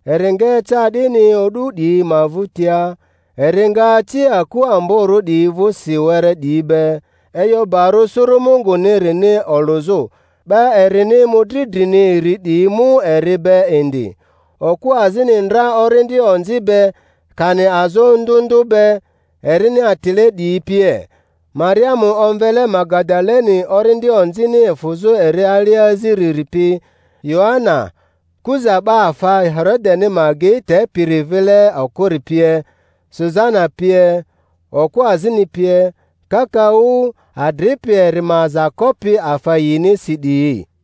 Eri nga eca 'dini o'du 'diyi ma vᴜtia, eri nga aci aku amborᴜ 'diyi vᴜsi were 'diyi be, e'yo barᴜ suru Mungunirini olᴜzᴜ, 'ba erini mᴜdri drini iri 'diyi mu eri be indi, okᴜ azini ndra orindi onzi be, kani azo ndᴜ ndᴜ be, erini atile 'diyi pie: Mariamu omvele Magadaleni orindi onzini efᴜzᴜ eri alia aziriri pi, Yoana, Kuza 'ba afa Herodeni ma agei tepiri vile okᴜri pie, Susana pie, okᴜ azini pie kakaᴜ, adripi eri ma aza kopi afa yinisi 'diyi.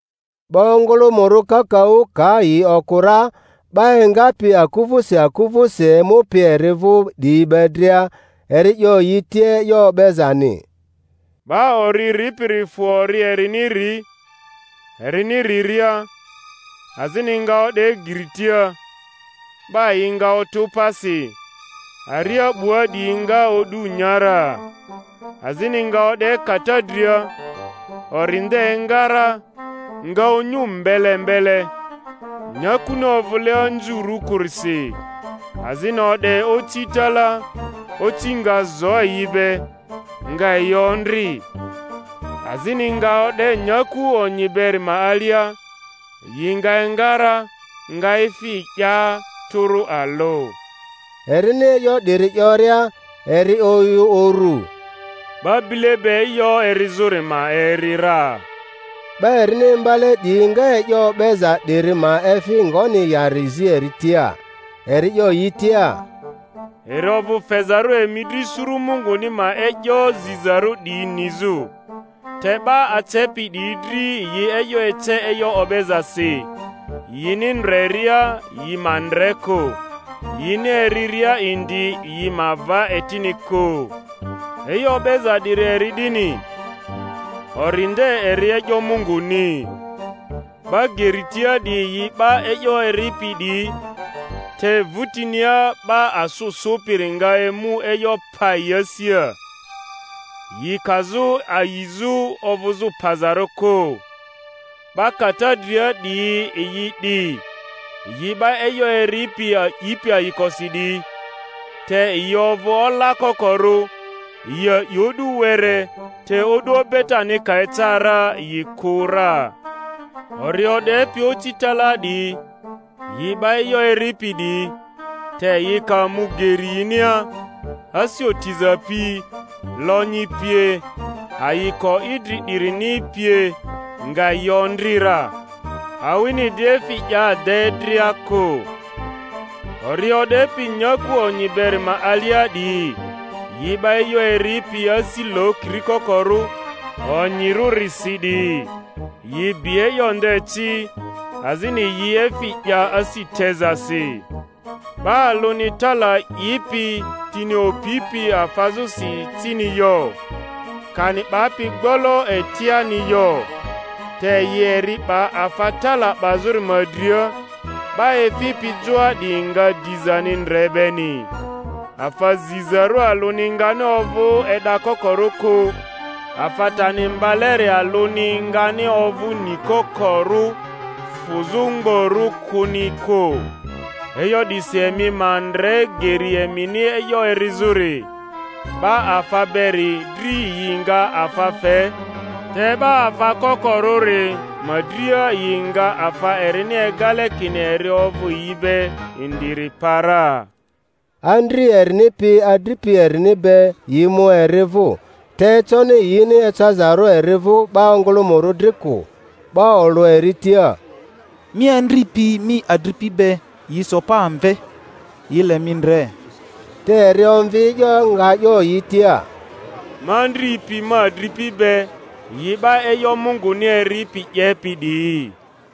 'Ba ongᴜlᴜmᴜrᴜ kakaᴜ ka yi okᴜ ra, 'ba engapi aku vᴜsi aku vᴜsi emupi eri vᴜ 'diyi be dria, eri 'yo yi tia e'yo o'bezani: 'Ba ori ripiri fᴜ ori erini ri; erini riria, azini nga o'de geri tia, 'ba yi nga otᴜ pasi, aria 'bua 'diyi nga o'du nya ra. Azini nga o'de kata dria; ori nde enga ra, nga onyu mbele mbele, nyakuni ovᴜle anzurᴜ kᴜrisi. Azini o'de oci talaa; oci nga zo yi be, nga yi ondri. Azini nga o'de nyaku onyi beri ma alia, yi nga enga ra, nga efi 'ya tᴜrᴜ alᴜ. Erini e'yo 'diri 'yoria, eri oyᴜ uru, 'Ba bile be e'yo erizᴜri ma eri ra. 'Ba erini imbale 'diyi nga e'yo o'beza 'diri ma efi ngoni yari zi eri tia. Eri 'yo yi tia, Eri ovᴜ fezarᴜ emi dri suru Munguni ma e'yo zizarᴜ 'diyi nizᴜ; te 'ba acepi 'diyi dri yi e'yo ece e'yo o'bezasi, yini ndreria yi ma ndre kᴜ, yini eriria indi yi ma va etini kᴜ. E'yo o'beza 'diri eri 'dini: Ori nde eri e'yo Munguni. 'Ba geri tia 'diyi yi 'ba e'yo eripi 'diyi, te vutinia 'ba asᴜ sᴜpiri nga emu e'yo pa yi asia, yi kazᴜ ayizᴜ ovᴜzᴜ pazarᴜ kᴜ. 'Ba kata dria 'diyi yi 'di, yi 'ba e'yo eripi a'ipi ayikosi 'diyi, te yi ovᴜ ola kokorᴜ, yi a'i o'du were, te o'du obetani ka eca ra yi kᴜ ra. Ori o'depi oci talaa 'diyi, yi 'ba e'yo eripi 'diyi, te yi ka mu geri yinia, asi otiza pi, lonyi pie, ayiko idri 'dirini pie nga yi ondri ra, awini di efi 'ya de dria kᴜ. Ori o'depi nyaku onyi beri ma alia 'diyi, yi 'ba e'yo eripi asi lokiri kokorᴜ onyirᴜrisi 'diyi, yi bi e'yo nde ci, azini yi efi 'ya asi tezasi. 'Ba alᴜni tala 'ipi tini opipi afazᴜsi cini yo, kani 'bapi gbolo etiani yo; te yi eri 'ba afa tala 'bazᴜri ma dria, 'ba efipi joa 'diyi nga dizani ndre beni. Afa zizarᴜ alᴜni ngani ovᴜ e'dakokorᴜ kᴜ, afa tani mbaleri alᴜni ngani ovᴜ nikokorᴜ, fᴜzᴜ mgborᴜ kᴜni kᴜ. E'yo 'disi emi ma ndre geri emini e'yo erizᴜri; 'ba afa beri dri yi nga afa fe, te 'ba afa kokorᴜri ma dria, yi nga afa erini egale kini eri ovᴜ yi be indiri pa ra. Andri erini pi adripi erini be yi mu eri vᴜ, te econi yini ecazarᴜ eri vᴜ 'ba ongᴜlᴜmᴜrᴜ dri kᴜ. 'Ba olᴜ eri tia, Mi andri pi mi adripi be yi so pa amve, yi le mi ndre. Te eri omvi e'yo, nga 'yo yi tia, Ma andri pi ma adripi be yi 'ba e'yo Munguni eripi 'yepi 'diyi.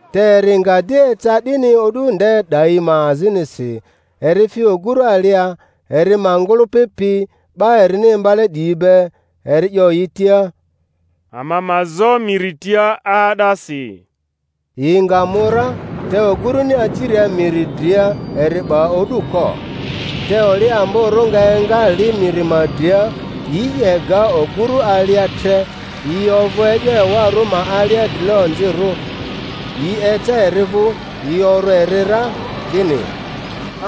Te eri nga di eca 'dini o'du nde 'dayi ma azinisi, eri fi oguru alia, eri ma ngᴜlᴜpi pi 'ba erini imbale 'diyi be, eri 'yo yi tia, Ama ma zo miri tia 'aa'dasi. Yi nga mu ra, te ogurᴜni aciria miri dria eri 'ba o'du ko. Te oli amborᴜ nga enga li miri ma dria, yi 'ye ga ogurᴜ alia tre, yi ovᴜ e'yo ewarᴜ ma alia drile-onzirᴜ. Yi eca eri vᴜ, yi orᴜ eri ra, kini,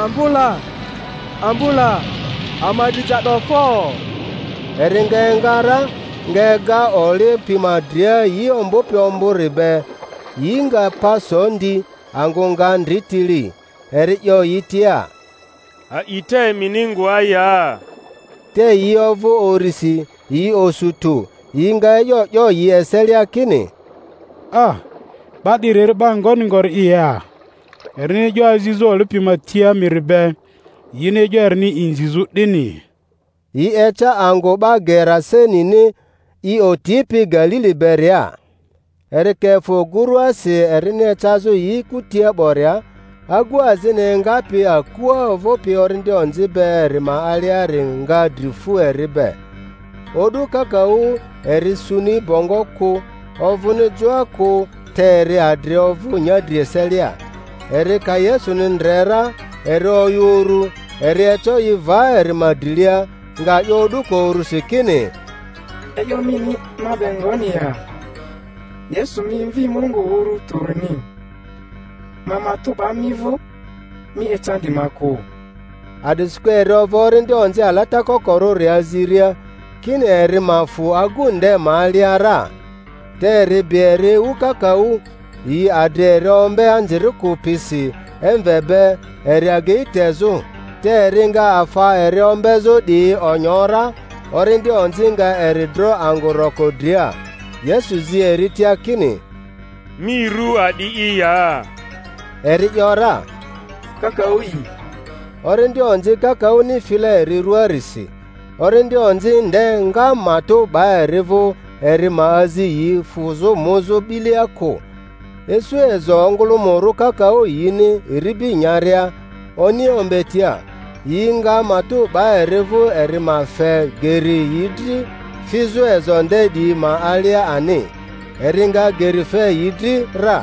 Ambo la! Ambo la! Ama dri ja 'do fo! Eri nga enga ra, nga ega oli pi ma dria yi ombᴜpi ombᴜri be; yi nga pa so ndi, angᴜ nga ndri tili. Eri 'yo yi tia. A'ita emini ngoa ya? Te yi ovᴜ urisi, yi osu tᴜ, yi nga e'yo 'yo yi eselia kini, 'Ba 'diri eri 'ba ngoni ngori'i ya, erini e'yo azizᴜ oli pi ma tia miri be, yini e'yo erini inzizᴜ 'dini? Yi eca angᴜ 'ba Gerasenini, i otipi Galili beria. Eri ka efᴜ oguruasi erini ecazᴜ yi kutia 'boria, agu azini engapi akua ovᴜpi orindi onzi be eri ma aliari nga dri fᴜ eri be; o'du kakaᴜ eri suni bongo kᴜ, ovᴜni joa kᴜ te eri adri ovᴜ nyadri eselia. Eri ka Yesuni ndre ra, eri oyᴜ urᴜ, eri eco i va eri ma drilia, nga 'yo o'duko urusi kini, E'yo mini ma be ngoni ya, Yesu mi Mvi Mungu Uru Tᴜrini? Ma matᴜ 'ba mi vᴜ, mi ecandi ma kᴜ. A'disikᴜ eri ovᴜ orindi onzi alata kokorᴜri aziria, kini eri ma fᴜ agu nde ma alia ra. (Te eri bi eri ewu kakaᴜ; yi adri eri ombe anzirikᴜ pisi emve be eri agei tezᴜ, te eri nga afa eri ombezᴜ 'diyi onyo ra, orindi onzi nga eri dro angᴜ roko dria.) Yesu zi eri tia kini, Mi ru a'di'i ya? Eri ‘yora, Kakaᴜ'i; orindi onzi kakaᴜni file eri rᴜaarisi. Orindi onzi nde nga matᴜ 'ba eri vᴜ eri ma azi yi fᴜzᴜ muzᴜ 'bilea kᴜ. Isu ezo ongᴜlᴜmᴜrᴜ kakaᴜ yini iribi nyaria oni ombetia; yi nga matᴜ 'ba eri vᴜ eri ma fe geri yi dri fizᴜ ezo nde 'diyi ma alia ani. Eri nga geri fe yi dri ra.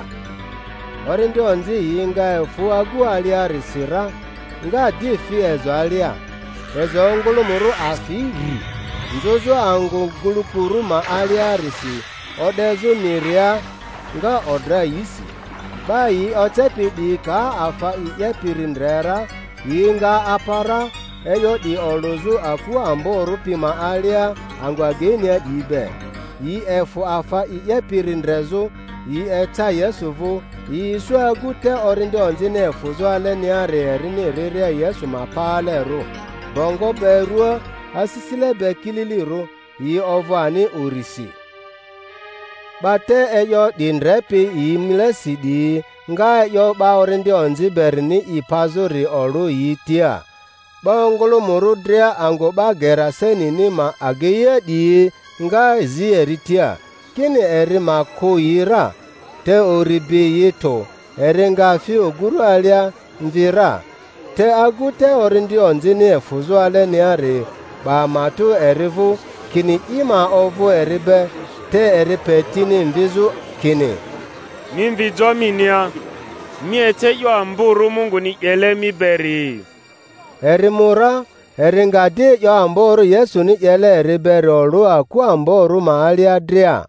Orindi onzi yi nga efᴜ agu aliarisi ra, nga di fi ezo alia; ezo ongᴜlᴜmᴜrᴜ afi rri nzᴜzᴜ angᴜ gulukurᴜ ma aliarisi o'dezᴜ miria, nga odra yisi. 'Ba yi ocepi 'diyi ka afa i 'yepiri ndre ra, yi nga apa ra, e'yo 'di olᴜzᴜ aku amborᴜ pi ma alia angᴜ ageinia 'diyi be. Yi efᴜ afa i 'yepiri ndrezᴜ, yi eca Yesuvᴜ, yi isu agu te orindi onzini efᴜzᴜ aleniari erini riria Yesu ma paalerᴜ, bongo be ruaa, asisile be kililirᴜ; yi ovᴜ ani urisi. 'Ba te e'yo 'di ndrepi yi milesi 'diyi nga e'yo 'ba orindi onzi berini i pazᴜri olᴜ yi tia. 'Ba ongᴜlᴜmᴜrᴜ dria angᴜ 'ba Gerasenini ma ageia 'diyi nga zi eri tia, kini eri ma kᴜ yi ra; te uri bi yi tᴜ; eri nga fi oguru alia, mvi ra. Te agu te orindi onzini efᴜzᴜ aleniari 'ba matᴜ eri vᴜ, kini i ma ovᴜ eri be; te eri pe tini mvizᴜ, kini, Mi mvi jo minia, mi ece e'yo amborᴜ Munguni 'yele mi beri. Eri mu ra, eri nga di e'yo amborᴜ Yesuni 'yele eri beri olᴜ aku amborᴜ ma alia dria.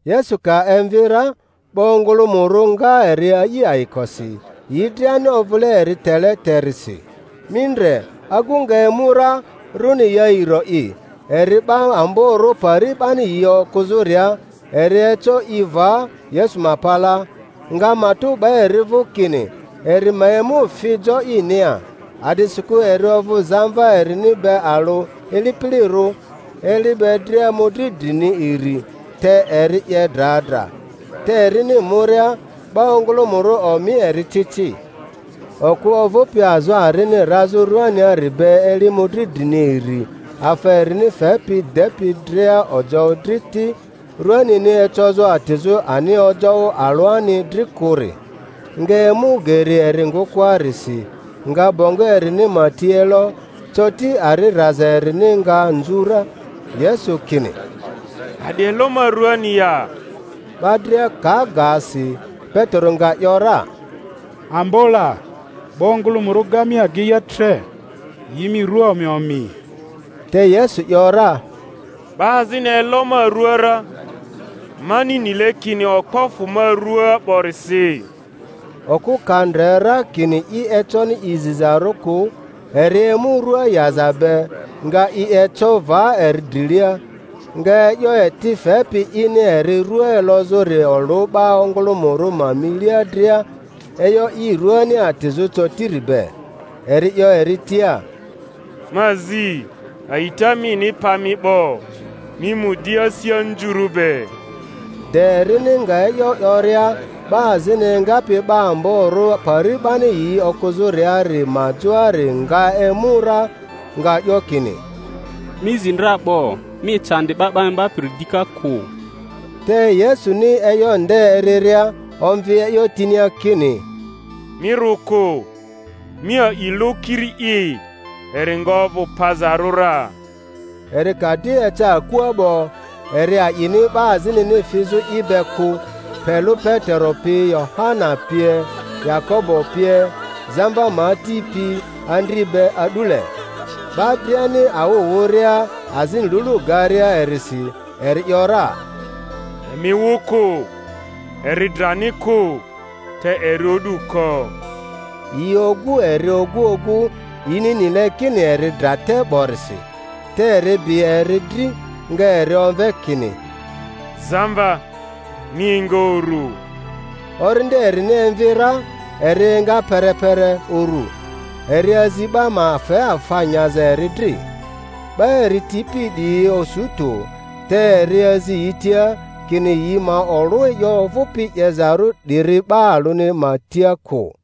Yesu ka emvi ra, 'ba ongᴜlᴜmᴜrᴜ nga eri a'i ayikosi, yi driani ovᴜle eri tele terisi. Mi ndre, agu nga emu ra, rᴜni Yairo'i, eri 'ba amborᴜ pari 'bani yi okᴜzᴜria; eri eco i va Yesu ma palaa, nga matᴜ 'ba eri vᴜ kini eri ma emu fi jo inia, a'disikᴜ eri ovᴜ zamva erini be alᴜ ilipilirᴜ, eli be dria mᴜdri drini iri, te eri 'ye dra dra. Te erini muria, 'ba ongᴜlᴜmᴜrᴜ omi eri ci ci. Okᴜ ovᴜpi azo arini razᴜ ruaniari be eli mᴜdri drini iri, afa erini fepi depi dria ojoᴜ dri ti, ruanini ecozᴜ atizᴜ ani ojoᴜ alᴜani dri kᴜri, nga emu geri eri ngᴜkᴜarisi, nga bongo erini ma ti elo; coti ari raza erini nga nzu ra. Yesu kini, A'di elo ma ruani ya? 'Ba dria ka ga si, Petero nga ‘yora, Ambo la, 'ba ongᴜlᴜmᴜrᴜ ga mi ageia tre, yi mi rua omi omi! Te Yesu ‘yora, 'Ba azini elo ma rua ra; mani nile kini okpo fᴜ ma ruaa 'borisi. Okᴜ ka ndre ra kini i econi i zizarᴜ kᴜ, eri emu rua yaza be, nga i eco va eri drilia, nga e'yo eti fepi ini eri rua elozᴜri olᴜ 'ba ongᴜlᴜmᴜrᴜ ma milia dria, e'yo i ruani atizᴜ cotiri be. Eri 'yo eri tia, Ma zi, a'ita mini pa mi 'bo; mi mu di asi anzurᴜ be. De erini nga e'yo 'yoria, 'ba azini engapi 'ba amborᴜ pari 'bani yi okᴜzᴜriari ma joari nga emu ra, nga 'yo kini, Mi zi dra 'bo; mi ecandi 'Ba 'ba Imbapiri dika kᴜ. Te Yesuni e'yo nde eriria, omvi e'yo tinia kini, Mi rᴜ kᴜ; mi a'i lᴜ kiri'i, eri nga ovᴜ pazarᴜ ra. Eri ka di eca akua 'bo, eri a'ini 'ba azinini fizᴜ i be kᴜ, pe lᴜ Petero pi, Yohana pie, Yakobo pie, zamva ma ati pi andri be a'dule. 'Ba driani awᴜ wᴜria azini lulu garia erisi, eri ‘yora, Emi wᴜ kᴜ; eri drani kᴜ, te eri o'du ko. Yi ogu eri ogu ogu, yini nile kini eri dra te 'borisi. Te eri bi eri dri, nga eri omve kini, Zamva, mi enga urᴜ. Orindi erini emvi ra, eri enga perepere urᴜ; eri azi 'ba ma fe afa nyaza eri dri. 'Ba eri tipi 'diyi osu tᴜ; te eri azi yi tia kini yi ma olᴜ e'yo ovᴜpi 'yezarᴜ 'diri 'ba alᴜni ma tia kᴜ.